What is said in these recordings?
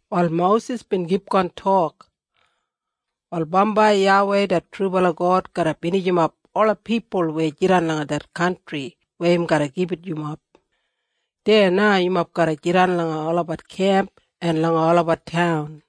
Wal Mosis bin kipgon tok, “Wal bambai YAWEI det trubala God garra binijimap ola pipul weya jidan langa det kantri weya im garra gibit yumob. Deya na yumob garra jidan langa olabat kemp en langa olabat taun.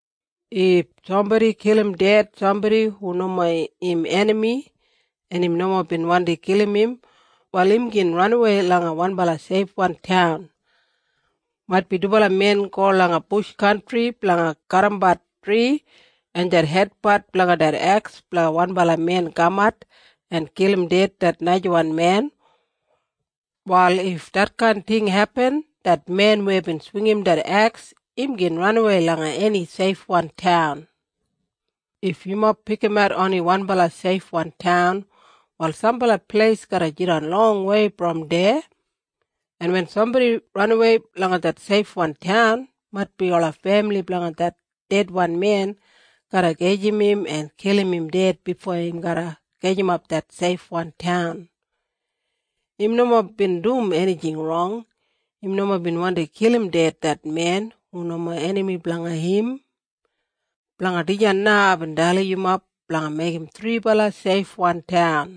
If sambodi kilim ded sambodi hu nomo im enami en im nomo bin wandi kilim im, wal im gin ranawei langa wanbala seifwan taun. Maitbi dubala men go langa bush kantri blanga kadimbat tri en det hedpat blanga det eks blanga wanbala men kamat en kilim ded det najawan men. Wal if detkain ting hepin det men weya bin swingim det eks im gin ranawei langa eni seifwan taun. If yumob pikimat oni wanbala seifwan taun wal sambala pleis garra jidan longwei brom deya. En wen sambodi ranawei langa det seifwan taun maitbi ola femili blanga det dedwan men garra gajim im en kilim im ded bifo im garra gajimap det seifwan taun. Im nomo bin dum enijing rong. Im nomo bin wandi kilim ded det men hu nomo enami blanga im. Blanga dijan na aibin dalim yumob blanga meigim thribala seifwan taun.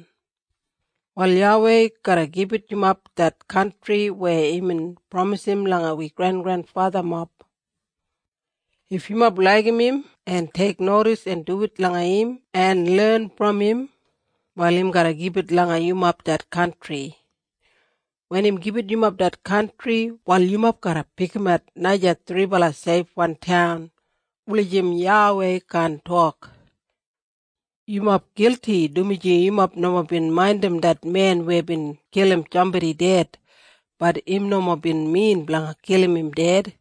“Wal YAWEI garra gibit yumob det kantri weya imbin pramisim langa wi grengrenfathamob. If yumob laigim im en teiknodis en duwit langa im en len brom im, wal im garra gibit yumob det kantri. Wen im gibit yumob det kantri wal yumob garra pikimat naja thribala seifwan taun, wulijim YAWEI kaan tok, ‘Yumob gilti dumaji yumob nomo bin maindim det men weya bin kilim sambodi ded, bat im nomo bin min blanga kilim im ded.’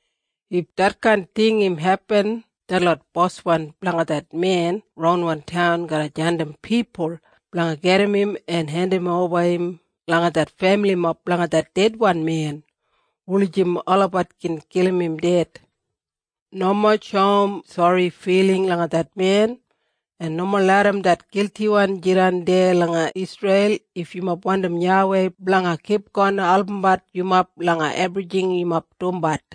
If diskain ting im hepin detlot boswan blanga det men ronwan taun garra jandim pipul blanga gedim im en hendimoba im langa det femilimob blanga det dedwan men, wulijim olabat gin kilim im ded. Nomo shoum sori filing langa det men, en nomo larram det giltiwan jidan deya langa Isreil if yumob wandim YAWEI blanga kipgon albumbat yumob langa ebrijing yumob dumbat.”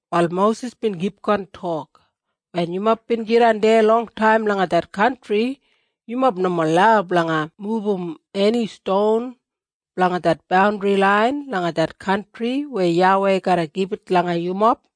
Wal Mosis bin kipgon tok, “Wen yumob bin jidan deya longtaim langa det kantri, yumob nomo lau blanga mubum eni ston blanga det bandri lain langa det kantri weya YAWEI garra gibit langa yumob.”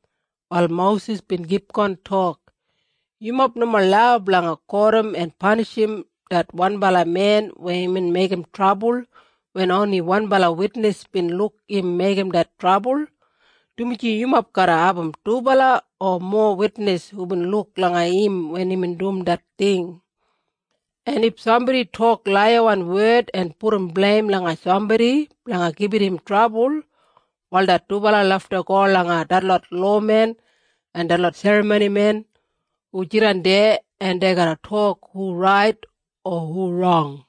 Wal Mosis bin kipgon tok, “Yumob nomo lau blanga kotim en panishim det wanbala men weya imbin meigim trabul wen oni wanbala witnis bin luk im meigim det trabul, dumaji yumob garra abum dubala o mowa witnis hubin luk langa im wen imbin dum det ting. En if sambodi tok laiyawan wed en pudum bleim langa sambodi blanga gibit im trabul, wal det dubala lafta go langa detlot lowamen en detlot serramonimen hu jidan deya en dei garra tok hu rait o hu rong.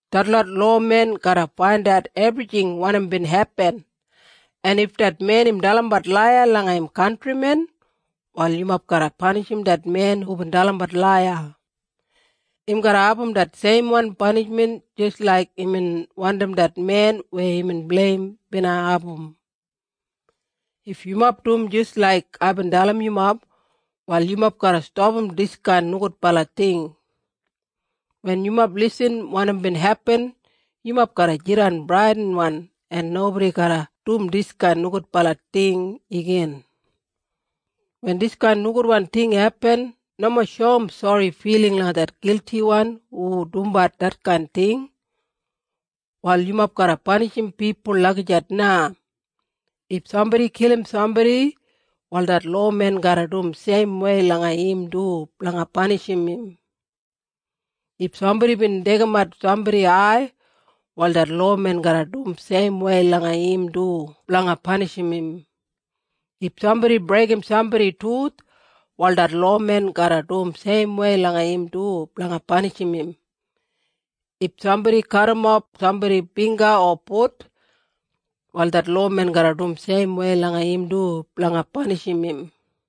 Detlot lowamen garra faindat ebrijing wanim bin hepin, en if det men im dalimbat laiya langa im kantrimen. Wal yumob garra panishim det men hubin dalimbat laiya. Im garra abum det seimwan panishmen jis laik imbin wandim det men weya imbin bleim bina abum. If yumob dum jis laik aibin dalim yumob, wal yumob garra stapam diskain nogudbala ting. Wen yumob irrim wanim bin hepin yumob garra jidan bradinwan en nobodi garra dum diskain nogudbala ting igin. Wen diskain nogudwan ting hepin nomo shoum sori filing langa det giltiwan hu dumbat detkain ting. Wal yumob garra panishim pipul lagijat na. If sambodi kilim sambodi, wal det lowamen garra dum seimwei langa im du blanga panishim im. If sambodi bin deigimat sambodi ai, wal det lowamen garra dum seimwei langa im du blanga panishim im. If sambodi breigim sambodi tuth, wal det lowamen garra dum seimwei langa im du blanga panishim im. If sambodi kadimof sambodi bingga o fut, wal det lowamen garra dum seimwei langa im du blanga panishim im.”